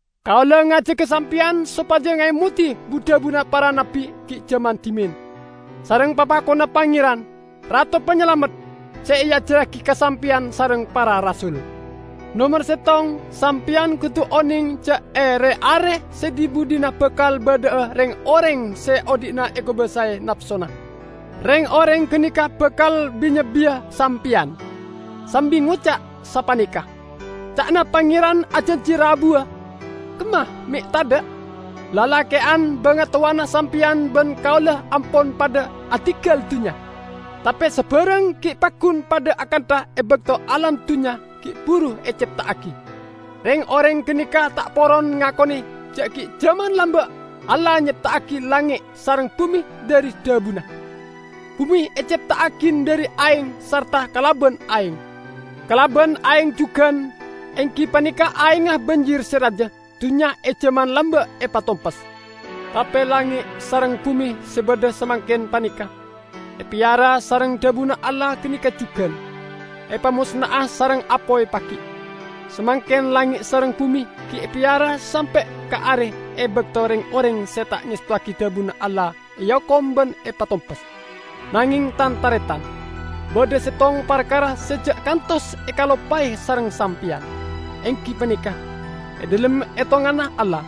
Kaula ngajaga sampeyan sopaja ngaemodi bu-dhabuna para nabbi gi' jaman dhimen, sareng papakonna Pangeran, Rato Panyalamet, se eajarragi ka sampeyan sareng para rasul. Nomer settong, sampeyan kodu oneng ja' e re-are se dhi-budhina bakal badha'a reng-oreng se odhi'na ekobasae napsona. Reng-oreng ganeka bakal bi-nyebbiya sampeyan, sambi ngoca' sapaneka, "Ca'na Pangeran ajanji rabuwa? Kemma me' tadha'? Lalake'an bangatowana sampeyan ban kaula ampon padha adinggal dunnya, tape sabarang gi' paggun padha akantha e bakto alam dunnya gi' buru ecepta'agi!" Reng-oreng ganeka ta' poron ngakone ja' gi' jaman lamba' Allah nyepta'agi langnge' sareng bume dhari dhabuna. Bume ecepta'agi dhari aeng sarta kalaban aeng; kalaban aeng jugan -- enggi paneka aengnga banjir se raja -- dunnya e jaman lamba' epatompes. Tape langnge' sareng bume se badha samangken paneka, epeyara sareng dhabuna Allah ganeka jugan, epamosna'a sareng apoy pagi'. Samangken langnge' sareng bume gi' epeyara sampe' ka are e bakto reng-oreng se ta' ngestowagi dhabuna Allah eokom ban epatompes. Nangeng tan-taretan, badha settong parkara se ja' kantos ekaloppae sareng sampeyan! Enggi paneka: e dhalem etonganna Allah,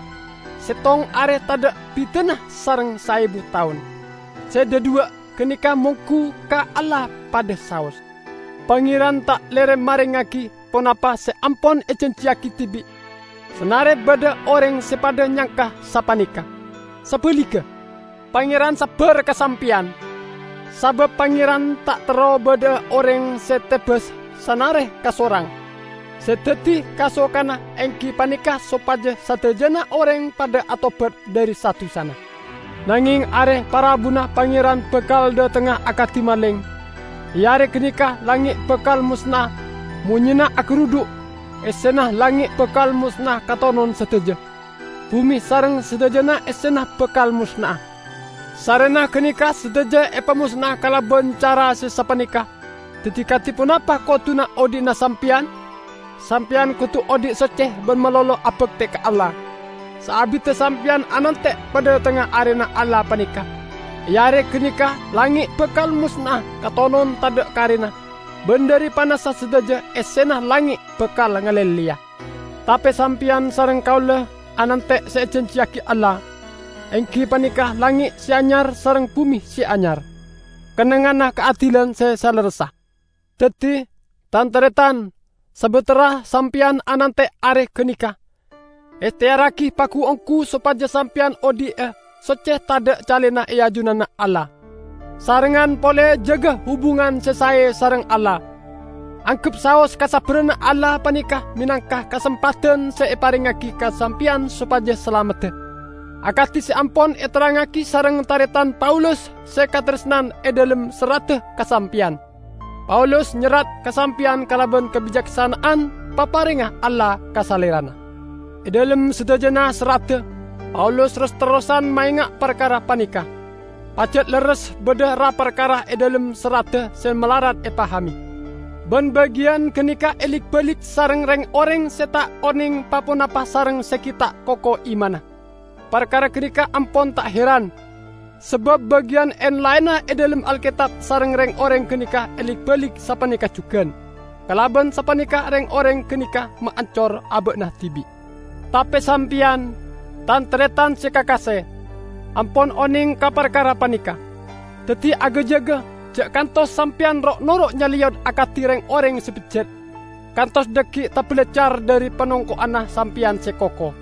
settong are tadha' bidana sareng saebu taon -- se dhadhuwa' ganeka monggu ka Allah padha saos. Pangeran ta' lere marengngagi ponapa se ampon ejanjiyagi dibi', sanare badha oreng se padha nyangka sapaneka. Sabaligga, Pangeran sabbar ka sampeyan, sabab Pangeran ta' terro badha'a oreng se tebas sanare kasorang. Se daddi kasokanna enggi paneka sopaja sadajana oreng padha atobat dhari sa-dusana. Nangeng Are Parabuna Pangeran bakal dhatengnga akadi maleng. E Are ganeka langnge' bakal mosna'a, monyena agarudhu', essena langnge' bakal mosna'a katonon sadaja, bume sareng sadajana essena bakal mosna'a. Sarrena ganeka sadaja epamosna'a kalaban cara se sapaneka, daddi kadi ponapa koduna odhi'na sampeyan? Sampeyan kodu odhi' socce ban malolo abakte ka Allah, saabidda sampeyan anante' padhatengnga Arena Allah paneka. E Are ganeka langnge' bakal mosna'a katonon tadha' karena, ban dhari panassa sadaja essena langnge' bakal ngalelleya. Tape sampeyan sareng kaula anante' se ejanjiyagi Allah, enggi paneka langnge' se anyar sareng bume se anyar, kennengnganna kaadilan se salerressa. Daddi, tan-taretan, sabatara sampeyan anante' Are ganeka, ehteyarragi pagu-onggu sopaja sampeyan odhi'a socce tadha' calena e ajunanna Allah. Sarengngan pole jaga hubungan se sae sareng Allah. Anggep saos kasabbaranna Allah paneka menangka kasempadan se eparengngagi ka sampeyan sopaja salamedda. Akadi se ampon eterrangngagi sareng taretan Paulus se kataresnan e dhalem serradda ka sampeyan. Paulus nyerrat ka sampeyan kalaban kabicaksana'an paparengnga Allah ka salerana. E dhalem sadajana serradda, Paulus ros-terrosan maenga' parkara paneka. Pajat lerres badha ra-parkara e dhalem serradda se malarat epahame. Ban bagiyan ganeka elik-balik sareng reng-oreng se ta' oneng pa-ponapa sareng se gi' ta' koko imanna. Parkara ganeka ampon ta' heran, sabab bagiyan en-laenna e dhalem Alketab sareng reng-oreng ganeka elik-balik sapaneka jugan. Kalaban sapaneka reng-oreng ganeka maancor aba'na dibi'. Tape sampeyan, tan-taretan se kakase, ampon oneng ka parkara paneka. Daddi, aga-jaga, ja' kantos sampeyan ro'-noro' nyaleyot akadi reng-oreng se bejjat, kantos dhaggi' tabalaccar dhari panongko'anna sampeyan se koko.